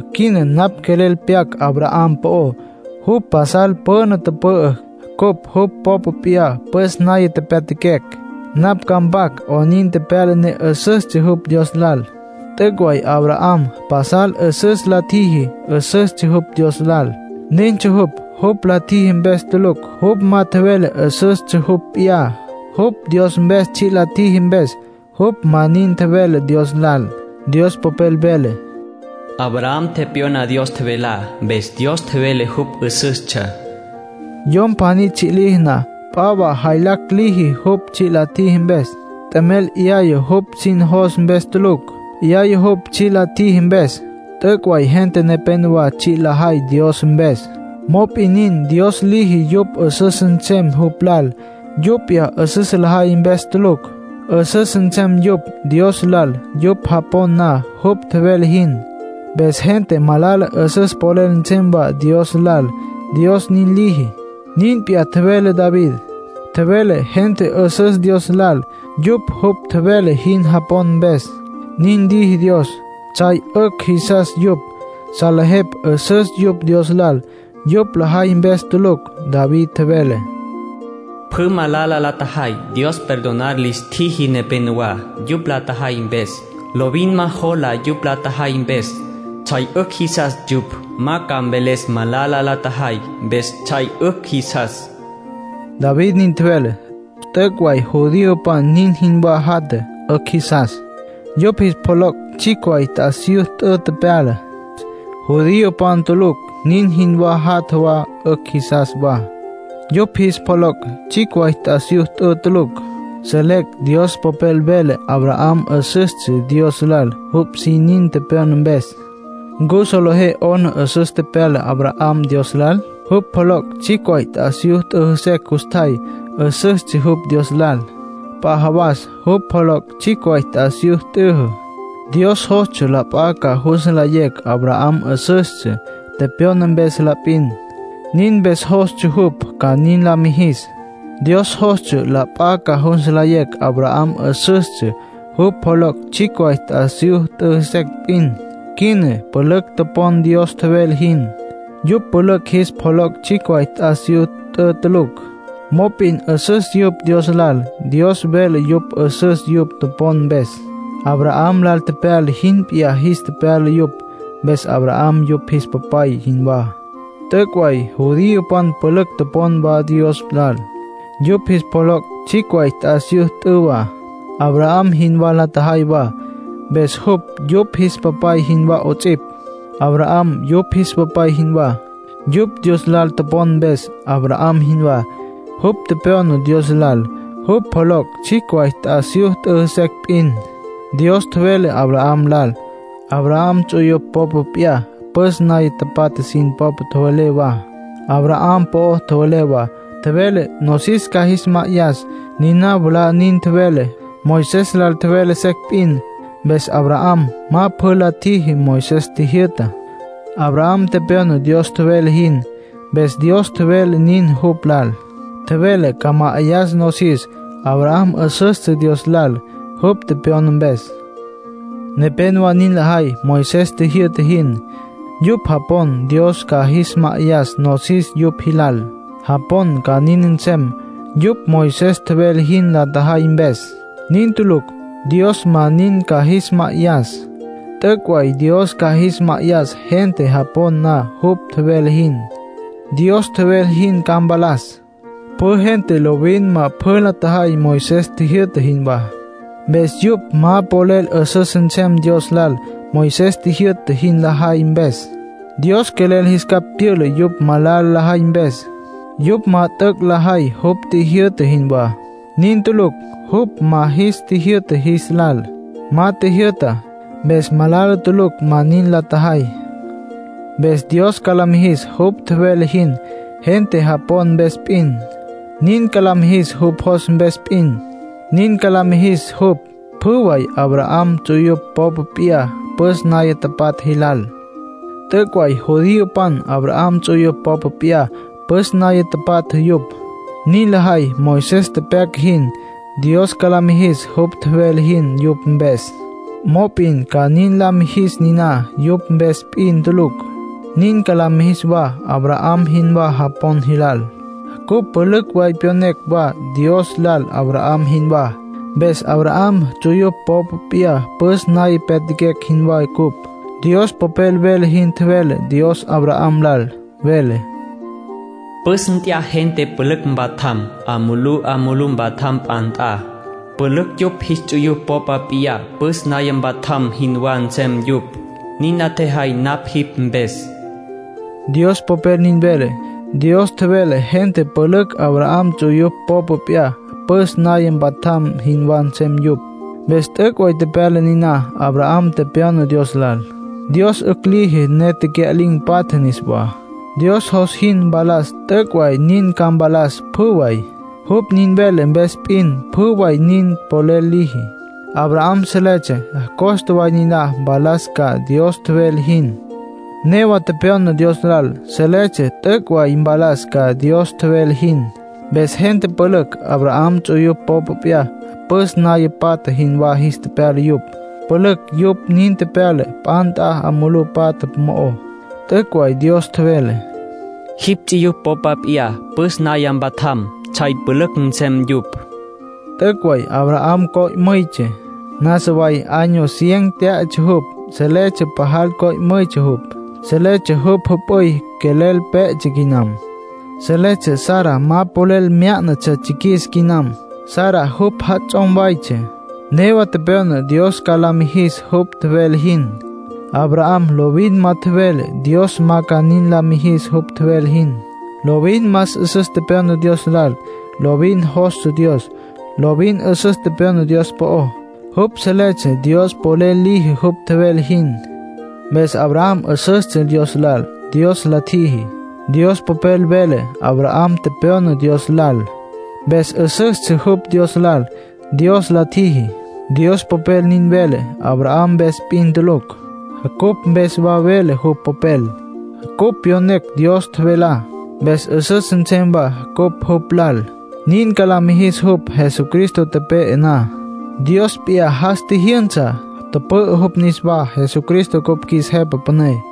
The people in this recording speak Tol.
Quina napj quelel pyac Abraham po'ó. Jupj pasal püna tüpü'ü, cupj jupj popa p'iyá püs naya pyatjaquecj. Napj ca mpac 'onin tepyala ne 'üsüstsja jupj Dios lal. T'üc' way Abraham pasal 'üsüs la tjiji. 'Üsüstsja jupj Dios lal. Nintsja jupj, jupj la tjiji mpes tulucj. Jupj ma tjevele 'üsüstsja jupj p'iyá, jupj Dios mpes tsji' la tjiji mpes. Jupj ma nin tjevele Dios lal. Dios Popel vele: “Abraham tepyona Dios tjevelá. Mpes Dios tjevele jupj 'üsüstsja.” Yom pjaní tsji' liji na, p'a wa jaylacj liji jupj tsji' la tjiji mpes. T'emel 'yaya jupj sin jos mpes tulucj. 'Yaya jupj tsji' la tjiji mpes. T'üc' way gente nepénowa tsji' lajay Dios mpes. Mop'in nin, Dios liji yupj 'üsüs nsem jupj lal, yupj p'iyá 'üsüs lajay mpes tulucj. 'Üsüs nsem yupj Dios lal yupj japon na jupj tjevele jin. Mpes gente malala 'üsüs polel nsem wa Dios lal, Dios nin liji. Nin p'iyá tjevele David. Tjevele gente 'üsüs Dios lal, yupj jupj tjevele jin topon mpes. Nin liji Dios. Tsjay 'ücj jisas yupj. Salejepj 'üsüs yupj Dios lal, yupj lajay mpes tulucj. David tjevele: “Pjü malala la tjajay. Dios perdonar lis tjiji nepenowá, yupj la tjajay mpes. Lovin ma jola yupj la tjajay mpes. Tsjay 'ücj jisas yupj. Ma ca mveles malala la tjajay. Mpes tsjay 'ücj jisas”, David nin tjevele. T'üc' way judiopan nin jinwá jatja, 'ücj jisas. Yupj jis pjoloc' tsjicj way t'asiyú t'ü tepyala. Judiopan tulucj nin jinwá jatja wa, 'ücj jisas wa. Yupj jis pjoloc' tsjicj way t'asiyú t'ü tulucj. Selecj Dios Popel vele Abraham 'üsüstsja Dios lal jupj sin nin tepyona mpes. ¿Ncu solejé 'ona 'üsüs tepyala Abraham Dios lal? Jupj pjoloc' tsjicj way t'asiyú t'yüjü secj custjay, 'üsüstsja jupj Dios lal. P'a jawas jupj pjoloc' tsjicj way t'asiyú t'yüjü. Dios jostsja la p'a ca jus nlayecj Abraham 'üsüstsja, tepyona mpes la p'in, nin mpes jostsja jupj ca nin la mijis. Dios jostsja la p'a ca jus nlayecj Abraham 'üsüstsja jupj pjoloc' t'asiyú t'yüjü secj p'in. Quina pülücj topon Dios tjevele jin. Yupj pülücj jis pjoloc' tsjicj way t'asiyú t'ü tulucj. Mop'in 'üsüs yupj Dios lal; Dios vele yupj 'üsüs yupj topon mpes. Abraham lal tepyala jin p'iyá jis tepyala yupj. Mpes Abraham yupj jis papay jinwá. T'üc' way judiopan pülücj topon wa Dios lal. Yupj jis pjoloc' tsjicj way t'asiyú t'ü wa. Abraham jinwá la tjajay wa, mpes jupj yupj jis papay jinwá 'ots'ipj. Abraham yupj jis papay jinwá, yupj Dios lal topon mpes, Abraham jinwá. Jupj tepyona Dios lal, jupj pjoloc' tsjicj way t'asiyú t'yüjü secj p'in. Dios tjevele Abraham lal. Abraham ts'uyupj popa p'iyá püs naya tapatja sin po'o tjevele wa, Abraham po'o tjevele wa. Tjevele nosis ca jis ma'ayas. Niná mwalá nin tjevele, Moisés lal tjevele secj p'in. Mpes Abraham ma pjü la tjiji Moisés tjijyü'tá. Abraham tepyona Dios tjevele jin, mpes Dios tjevele niná jupj lal, tjevele ca ma'ayas nosis. Abraham 'üsüstsja Dios lal jupj tepyona mpes. Nepénowa nin lajay Moisés tjijyü'ta jin. Yupj japon Dios ca jis ma'ayas nosis yupj jilal. Japon ca nin nsem yupj Moisés tjevele jin la tjajay mpes. Nin tulucj. Dios ma nin ca jis ma'ayas. T'üc' way Dios ca jis ma'ayas gente japon na jupj tjevele jin. Dios tjevele jin ca mpalas. Pjü gente lovin ma pjü la tjajay Moisés tjijyü'ta jinwá. Mpes yupj ma polel 'üsüs nsem Dios lal Moisés jyü'ta jin lajay mpes. Dios quelel jis capj tyüla yupj malala lajay mpes, yupj ma t'üc' lajay jupj tjijyü'ta jinwá. Nin tulucj jupj ma jis tjijyü'ta jis lal. Ma tjijyü'ta, mpes malala tulucj ma nin la tjajay. Mpes Dios ca la mijis jupj tjevele jin, gente japon mpes p'in. Nin ca la mijis, jupj jos mpes p'in. Nin ca la mijis jupj pjü way Abraham ts'uyupj popa p'iyá püs naya patja jilal. T'üc' way judiopan Abraham ts'uyupj popa p'iyá püs naya patja yupj. Nin lajay Moisés tepyaca jin. Dios ca la mijis jupj tjevele jin yupj mpes. Mop'in ca nin la mijis niná yupj mpes p'in tulucj. Nin ca la mijis wa Abraham jinwá japon jilal. Cupj pülücj way pyonecj wa Dios lal Abraham jinwá, mpes Abraham ts'uyupj popa p'iyá püs naya pyatjaquecj jinwá cupj. Dios Popel vele jin tjevele Dios Abraham lal. Vele: “Püs nt'aya gente pülücj ca mpatjam. 'A mulú, 'a mulú mpatjam p'a nt'a. Pülücj yupj jipj ts'uyupj popa p'iyá püs naya mpatjam jinwá nsem yupj, nin la tjejay napj jipj mpes”, Dios Popel nin vele. Dios tjevele gente pülücj Abraham ts'uyupj popa p'iyá püs naya mpatjam jinwá nsem yupj. Mpes t'üc' way tepyala niná. Abraham tepyona Dios lal. Dios 'ücj liji ne tecya'lin̈ patja niswá. Dios jos jin mpalas, t'üc' way nin ca mpalas, pjü way, jupj nin vele mpes p'in. Pjü way nin polel liji. Abraham seletsja costa way niná mpalas ca Dios tjevele jin. Newa tepyona Dios lal, seletsja t'üc' way mpalas ca Dios tjevele jin. Mpes gente pülücj Abraham ts'uyupj popa p'iyá püs naya patja jinwá jis tepyala yupj, pülücj yupj nin tepyala p'a nt'a 'a mulú patja mo'ó. T'üc' way Dios tjevele: “Jipj ts'uyupj popa p'iyá püs naya mpatjam, tsjay pülücj nsem yupj”. T'üc' way Abraham co'müytsja. Nasa way año cien tyá'atsja jupj. Seletsja pajal co'müytsja jupj. Seletsja jupj jüp'üy quelel pé'etsja quinam. Seletsja Sara ma polel myá'natsja tsjiquis quinam. (Sara jupj jats'om waytsja.) Newa tepyona Dios ca la mijis jupj tjevele jin. Abraham lovin ma tjevele Dios ma ca nin la mijis jupj tjevele jin. Lovin más 'üsüs tepyona Dios lal. Lovin jostsja Dios. Lovin 'üsüs tjevele Dios po'ó. Jupj seletsja Dios polel liji jupj tjevele jin. Mpes Abraham 'üsüstsja Dios lal, Dios la tjiji. Dios Popel vele: “Abraham tepyona Dios lal, mpes 'üsüstsja jupj Dios lal, Dios la tjiji”. Dios Popel nin vele Abraham mpes p'in tulucj. Cupj mpes wa vele jupj Popel. Cupj pyonecj Dios tjevelá, mpes 'üsüs nsem wa cupj jupj lal, nin ca la mijis jupj. Jesucristo tepe'e na, Dios p'iyá jas tjijyünsa, tüpü'ü jupj niswá. Jesucristo cupj qjuis Jepa Püné.